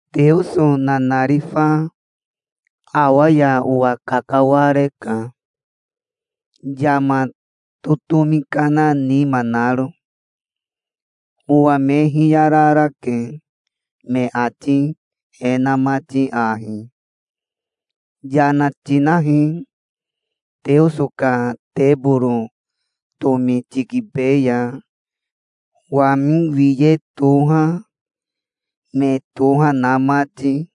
Teoso nanarifa awa ya owa kakawareka, yama totomi kana nima naro. Owa me hiyararake, me ati e na mati ahi: "Yana tinahi, Teoso ka teboro tomi tikibeya. Wami wiye toha, me toha na mati,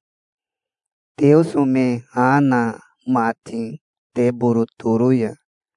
Teoso me ha na mati teboro toro ya.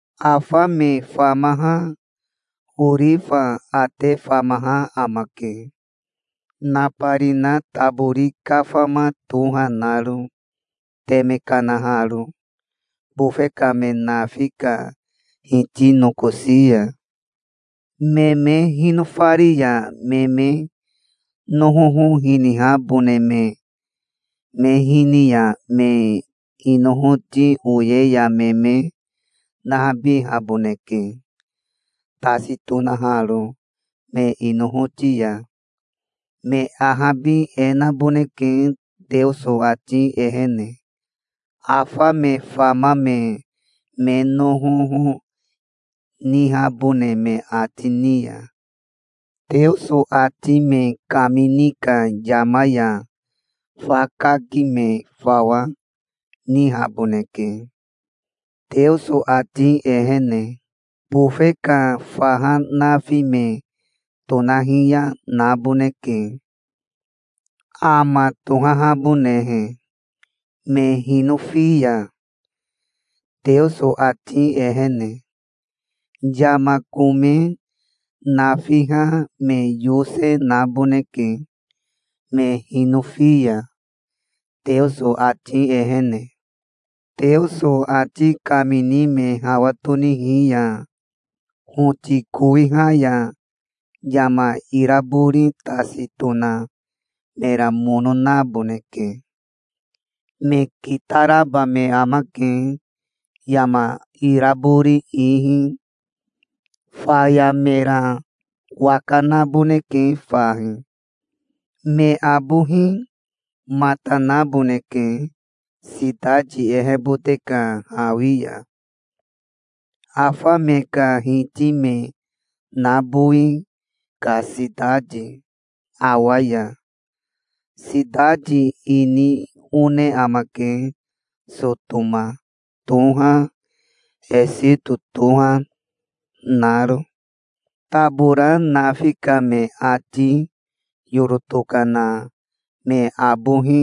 Afa me famaha orifa ate famaha amake, nabarina tabori kafama toha naro, teme kanaharo bofe ka me nafi ka Hiti nokosi ya. Me me hinofari ya me me nohoho hinihabone me me hini ya me inohoti oye ya me me nahabihaboneke, tasi tonaharo me inohoti ya. Me ahabi e naboneke Teoso ati ehene, afa me fama me me nohoho nihabone me ati ni ya. Teoso ati me kamini ka yama ya fa kaki me fawa nihaboneke, Teoso ati ehene. Bofe ka faha nafi me tonahiya naboneke, ama tohahabonehe, me hinofi ya, Teoso ati ehene. Yama kome nafiha me yose naboneke, me hinofi ya, Teoso ati ehene. Teoso ati kamini me hawa tonihi ya hoti kowiha ya yama irabori tasi tona mera mono naboneke. Me kitaraba me amake, yama irabori ihi. Faya mera waka naboneke fahi. Me abohi mata naboneke sitati ehebote ka hawi ya, afa me ka Hiti me nabowi ka sitati, awa ya. Sitati ini one amake Sotoma toha, Esito toha, naro. Tabora nafi ka me ati yoro tokana me abohi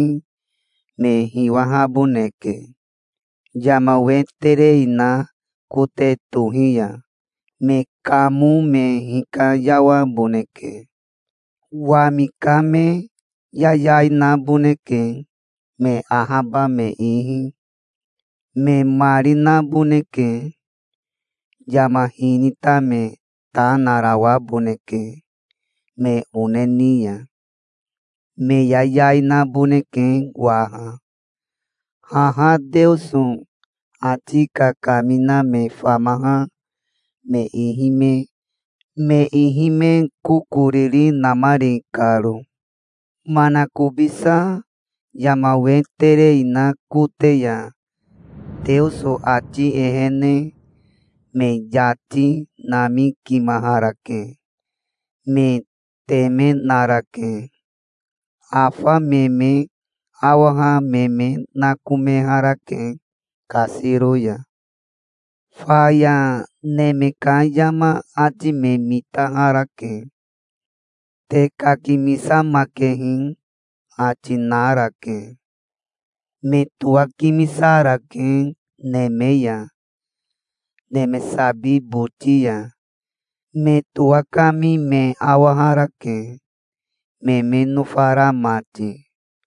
me hiwahaboneke, yama we terei na kote tohi ya. Me kamo me hikayawaboneke. Wami ka me yayai naboneke, me ahaba me ihi. Me mari naboneke. Yama hinita me ta narawaboneke me one ni ya. Me yayai naboneke waha, haha Teoso ati kakamina me famaha me ihi me kokoriri namari karo. Manakobisa yama we terei na kote ya Teoso ati ehene me yati namikimaharake. Me teme narake. Afa me me awaha me me nakomeharake kasiro ya. Faya neme ka yama ati me mitaharake. "Te kakimisamakehi", ati narake. Me towakimisarake neme ya, neme sabi boti ya. Me towakami me awaharake, me me nofara mati.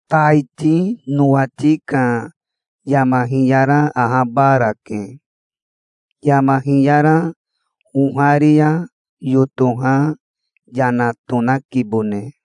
Taiti nowati ka yama hiyara ahabarake. Yama hiyara oharia yotoha yana tonakibone.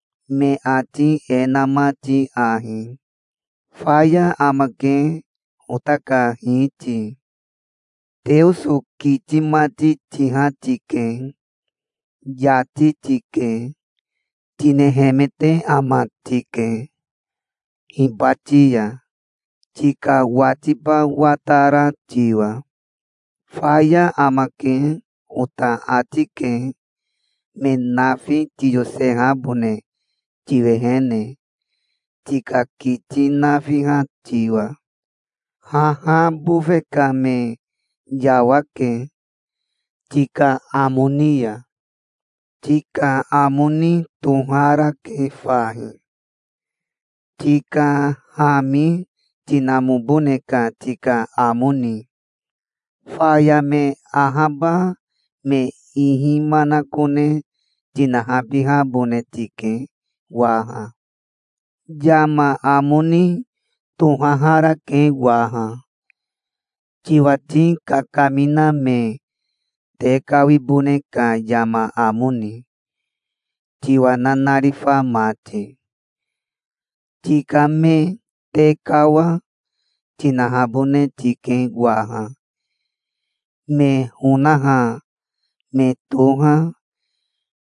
me ati e na mati ahi: "Faya amake, ota ka Hiti. Teoso kiti mati tiha tike. Yati tike. Tinehemete ama tike hibati ya, tika watiba watara tiwa. 'Faya amake', ota ati ke, me nafi tiyosehabone tiwehene, tika kiti nafiha tiwa. Haha bofe ka me yawake, tika amo ni ya. Tika amo ni toharake fahi, tika hami tinamobone ka tika amo ni. Faya me ahaba me ihi manakone tinahabihabone tike waha. Yama amo ni tohaharake waha, tiwati kakamina me tekawibone ka yama amo ni, tiwa nanarifa mati. Tika me tekawa, tinahabone tike waha, me honaha me toha,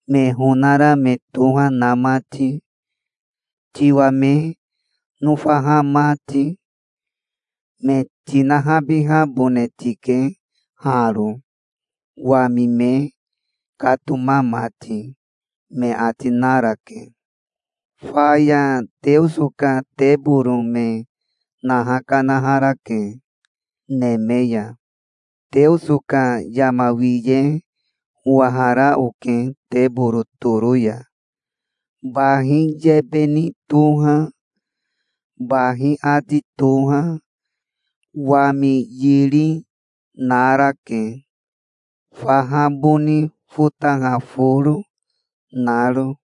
me honara me toha na mati, tiwa me nofaha mati. Me tinahabihabone tike haro, wami me katoma mati", me ati narake. Faya Teoso ka teboro me naha kanaharake neme ya. Teoso ka yama wiye owahara oke teboro toro ya. Bahi yebe ni toha, bahi ati toha, wami yiri, narake, faha boni fotaha foro, naro.